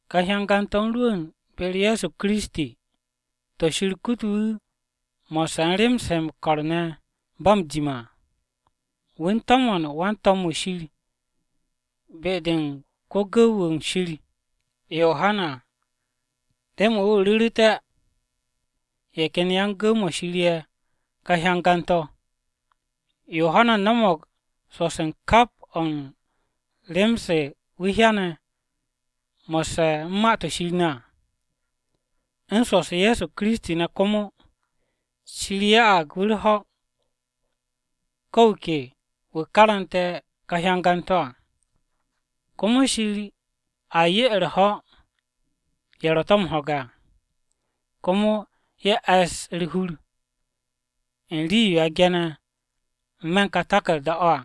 Ka hyangan-to̱ u̱n rwu̱u̱n be-u̱r Ye̱so Kiristi, to̱ Shir kute̱ wu̱ mo̱sse̱ u̱n rem-se he m-ko̱r ne̱ ba m-jime̱ à. Wu̱ u̱n to̱mo̱n wan-to̱m-wu̱ Shir be-de u̱n ko-gu̱w-wu̱ u̱n Shir Yohana remen wu̱ ru̱ru̱té̱ ye̱ ken yan-gu̱w-mo̱ Shir ye̱ ka hyangan-to̱. Yohana no̱mo̱g swo̱-se u̱n kap o̱ u̱n rem-se wu̱ hyane̱ mo̱sse̱ u̱n ma-to̱ Shir ne̱ à, u̱n swo̱-u̱s Ye̱so Kiristi ne̱ komo. Shir ya'ag wu̱ u̱r-ho̱ ko̱ wu̱ ke wu̱ karante̱ ka hyangan-to̱ à, komo Shir a 'ye u̱r-ho̱ u̱n ye̱ ro̱ to̱ m-ho̱ge̱ à komo ye̱ e̱ss u̱r-hur u̱n rii-yo a ge̱ne̱ n-me̱ u̱n ka taku̱rda-o̱ à,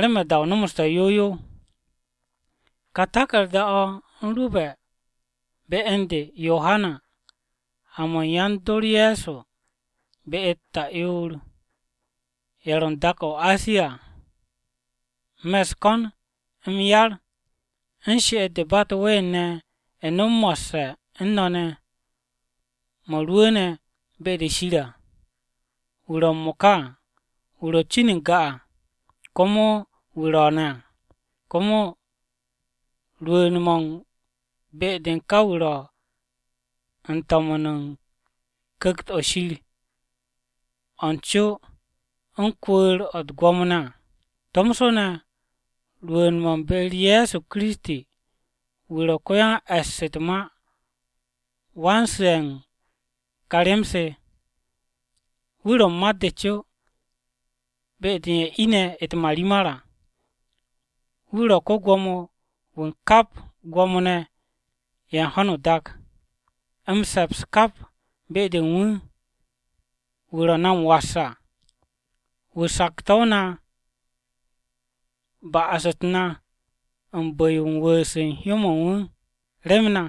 remen da-o nomsu̱nte̱ yow yow. Ka taku̱rda-o̱ u̱n rwu̱be̱ be u̱n de Yohana, ha-mo̱ u̱n yan-dor Ye̱so be-u̱t ta'yoor-ye̱ ro̱ u̱n dak-o̱ o-Asiya à: Me̱ u̱s-ko̱n m-yar u̱n she'et-de ba u̱t-ween ne̱ nom mo̱sse̱ u̱n no̱ ne̱ mo̱ rwu̱u̱ne̱ be-de Shir à, wu̱ ro̱ m-mo̱ka à, wu̱ ro cin n-ga à, komo wu̱ ro̱o̱ne̱ à, komo rwu̱u̱n-mo̱ u̱n be-de u̱n ka wu̱ ro̱ u̱n to̱mo̱n u̱n Ku̱kt-o̱ Shir o̱ n-co o̱ u̱n kwu̱u̱r-o̱ u̱t-gwo̱mo à, tomso ne̱ rwu̱u̱n-mo̱ u̱n be-u̱r Ye̱so Kiristi wu̱ ro̱ ko-yan-e̱ss u̱t-ma wan-su̱'e̱ u̱n ka rem-se. Wu̱ ro̱ mat-de co, be-de u̱n ye̱ ine̱ u̱t-marimar à. Wu̱ ro̱ ko-Gwo̱mo-wu̱ u̱n kap Gwo̱mo-ne̱ ye̱ u̱n ho̱no o-dak. M-se̱ps kap be-de u̱n wu̱, wu̱ ro̱ na m-was à. Wu̱ sokse̱ na ba'as-u̱t na u̱n bu̱-yo u̱n wu̱u̱s u̱n hyó-mo̱ u̱n wu̱ rem na.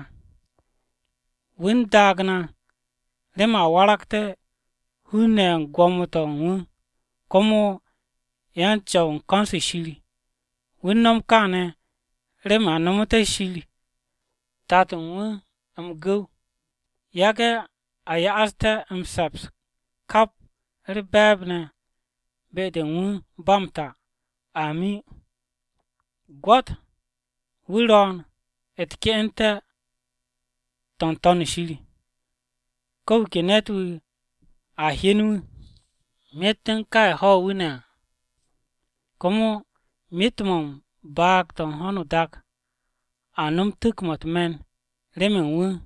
Wu̱ u̱n daag na remen a waragté̱ hun-ne̱ ye̱ u̱n gwo̱mo-to̱ u̱n wu̱, komo yan-Co̱w u̱n ko̱n-se Shir. Wu̱ u̱n no̱m kaane̱ remen a nomoté̱ Shir, Tato-o̱ u̱n wu̱ m-gu̱w. Yage̱ a ya'aste̱ m-se̱ps kap u̱r-be̱e̱b ne̱ be-de u̱n wu̱ ba m-ta! Amin. Gwo̱t! Wu̱ ro̱o̱n u̱t-ke'ente̱ to̱ n-To̱n shir. Ko̱ wu̱ ke ne̱t-wu̱ a hyen wu̱, myet u̱n ka ye̱ ho̱ wu̱ ne̱ à. Komo myet-mo̱ u̱n baag-to̱ u̱n ho̱no o-dak a nom tu̱k-mo̱ u̱t-me̱n remen wu̱.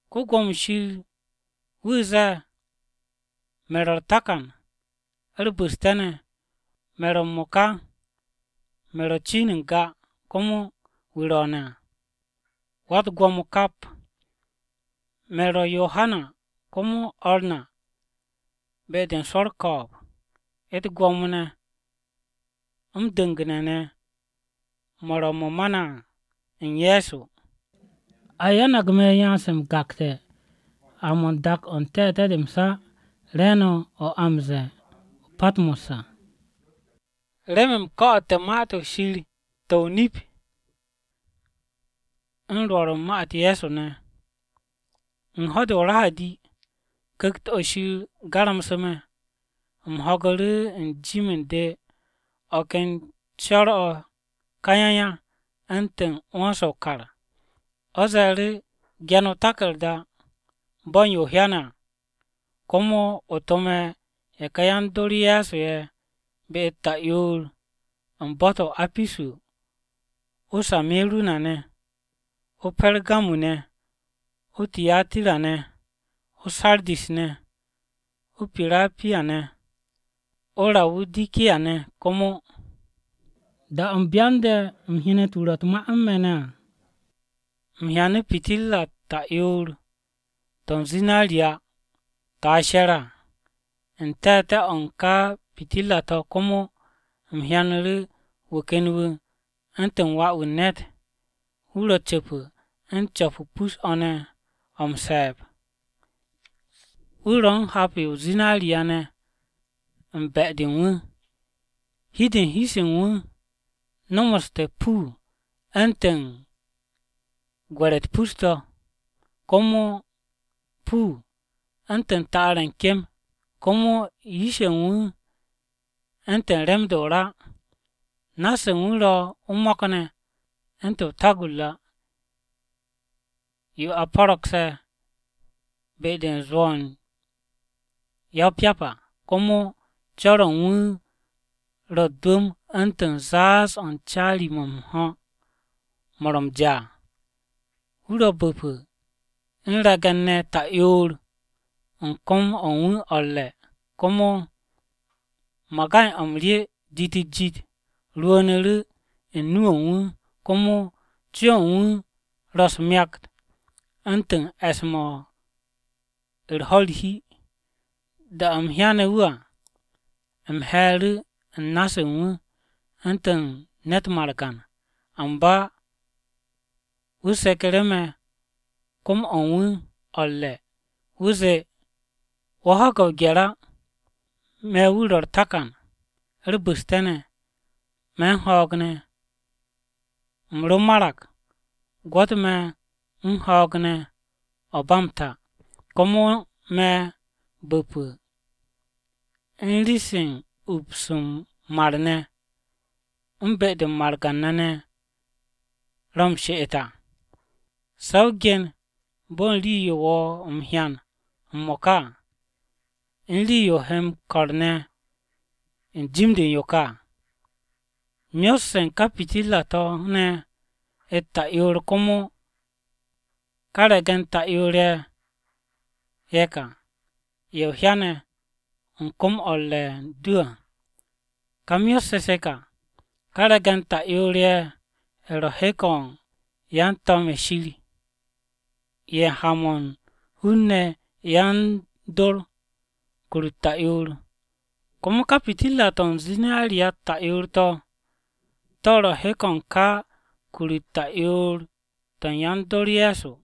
Wan-Ko̱yan Shir wu̱ ze̱e̱, “Me̱ ro̱ u̱r-Takan, u̱r-Bu̱ste̱ ne̱. Me̱ ro̱ m-mo̱ka, me̱ ro cin n-ga, komo wu̱ ro̱o̱ne̱ à, Wa-u̱t-Gwo̱mo kap.” Me̱ ro̱ Yohana, komo o̱r no̱ be-de u̱n swo̱ u̱r-ko̱o̱b, u̱t-gwo̱mo ne̱ m-du̱ngu̱ne̱ ne̱ mo̱ ro̱ mo̱ ma na à u̱n Ye̱so. A yanag me̱ yan-se m-gakte̱ ha-mo̱ u̱n dak-o̱ u̱n te̱te̱-de m-sa re̱e̱no̱ o̱ a m-ze̱e̱ o-Patmo̱s à remen u̱m ko̱'o̱te̱ Ma-to̱ Shir to̱ o-nip u̱n rwo̱r u̱n ma-u̱t Ye̱so ne̱. U̱n ho̱-de o-Rahadi,Ku̱kt-o̱ Shir garamse̱ me̱, u̱m ho̱gu̱ru̱ u̱n jim u̱n de o̱ ken co̱r-o̱ kayaya u̱ntu̱n 'wo̱n-se o-kar. O̱ ze̱e̱ru̱, “Ge̱n o-taku̱rda bo̱ u̱n yo o hyane̱ à. Komo o tome̱ ye̱ ká yan-dor Ye̱so ye̱ be-u̱t ta'yoor u̱n bo̱-to̱ o-Apisu, o-Se̱miru̱na ne̱, o-Pergamu ne̱, o-Tiyatira ne̱, o-Saradis ne̱, o-Pirapiya ne̱, o-Rawudikiya ne̱ komo.” Da-o̱ u̱m byande̱ u̱m hyenet wu̱ ro̱ u̱t-ma u̱n me̱ ne̱ à, U̱m hyanu̱ pitirra-u̱t ta'yoor-to̱ u̱n zinariya to̱ a she̱re̱ à. U̱n te̱te̱-o̱ u̱n ká pitirra-to̱ komo u̱m hyanu̱ru̱ wu̱ ken wu̱ “u̱ntu̱n Wà-wu̱ u̱n ne̱t.” Wu̱ ro̱ cu̱pu̱ u̱n co̱p-o pus-o̱ ne̱ o̱ m-se̱e̱b, wu̱ ro̱ u̱n hap-yo o-zinariya ne̱ u̱n be̱-de u̱n wu̱. Hi-de u̱n wu̱ u̱n hi-se u̱n wu̱ ne̱ nomoste̱ puu u̱ntu̱n gwe̱re̱-u̱t pus-to̱, komo puu u̱ntu̱n ta'ar-ye̱ u̱n kem. Komo yish-ye̱ u̱n wu̱ u̱ntu̱n rem-de o-ra. Na-se u̱n wu̱ ro̱ o-mo̱k ne̱ u̱ntu̱n o-tagurra yo a po̱ro̱gse̱, be-de u̱n zwo̱-o̱ u̱n ya-o-pyap à. Komo co̱r-o̱ u̱n wu̱ ro̱ u̱t-dwu̱m u̱ntu̱n zaaz-o̱ u̱n caari-mo̱ m-ho̱ mo̱ ro̱ m-ja à. Wu̱ ro̱ bu̱pu̱ u̱n re̱ge̱n-ne̱ ta'yoor u̱n kom-o̱ u̱n wu̱ o̱ u̱r-re̱. Komo magay-o̱ m-rye jit-u̱t-jit rwu̱u̱nu̱ru̱ u̱n nu-o̱ u̱n wu̱. Komo co-o̱ u̱n wu̱ ro̱ u̱s-myakt u̱ntu̱n e̱s-mo̱ u̱r-ho̱ u̱r-hi. Da-o̱ u̱m hyane̱ wu̱ à, u̱m he̱e̱ru̱ u̱n na-se u̱n wu̱ u̱ntu̱n ne̱t margan. Amba wu̱ seku̱ru̱ me̱ kom-o̱ u̱n wu̱ o̱ u̱r-re̱. Wu̱ zee, “Wo̱ ho̱ge̱ o-gye̱r á! Me̱ wu̱ ro̱ u̱r-Takan u̱r-Bu̱ste̱ ne̱. Me̱ u̱n ho̱o̱g ne̱! U̱m ro marag, gwo̱t me̱ u̱n ho̱o̱g ne̱ o̱ ba m-ta! Komo me̱ bu̱pu̱ u̱n rii-se u̱n ups m-mar ne̱ u̱n be-de margan-ne̱ ro̱ m-she'et à. “Se̱ o gen bo̱ u̱n rii-yo wo̱ m-hyan m-mo̱ka à, u̱n rii-yo he m-ko̱r ne̱ n-jim de u̱n yo ka à. Myot-se u̱n ka pitirra-to̱ ne̱ u̱t-ta'yoor komo u̱n ka re̱ge̱n ta'yoor-ye̱, ka ye̱ o hyane̱ u̱n kom-o̱ u̱n re̱ u̱n de à. Ka myot-se se ka: Ka re̱ge̱n ta'yoor-ye̱ ro̱ hek-o̱ u̱n ka yan-to̱m-ye̱ Shir ye̱ ha-mo̱ u̱n hun-ne̱ yan-dor kur-u̱t ta'yoor. Komo ká pitirra-to̱ u̱n zinariya-u̱t ta'yoor-to̱, to̱ ro̱ hek-o̱ u̱n ká kur-u̱t ta'yoor-to̱ to̱ u̱n yan-dor Ye̱so.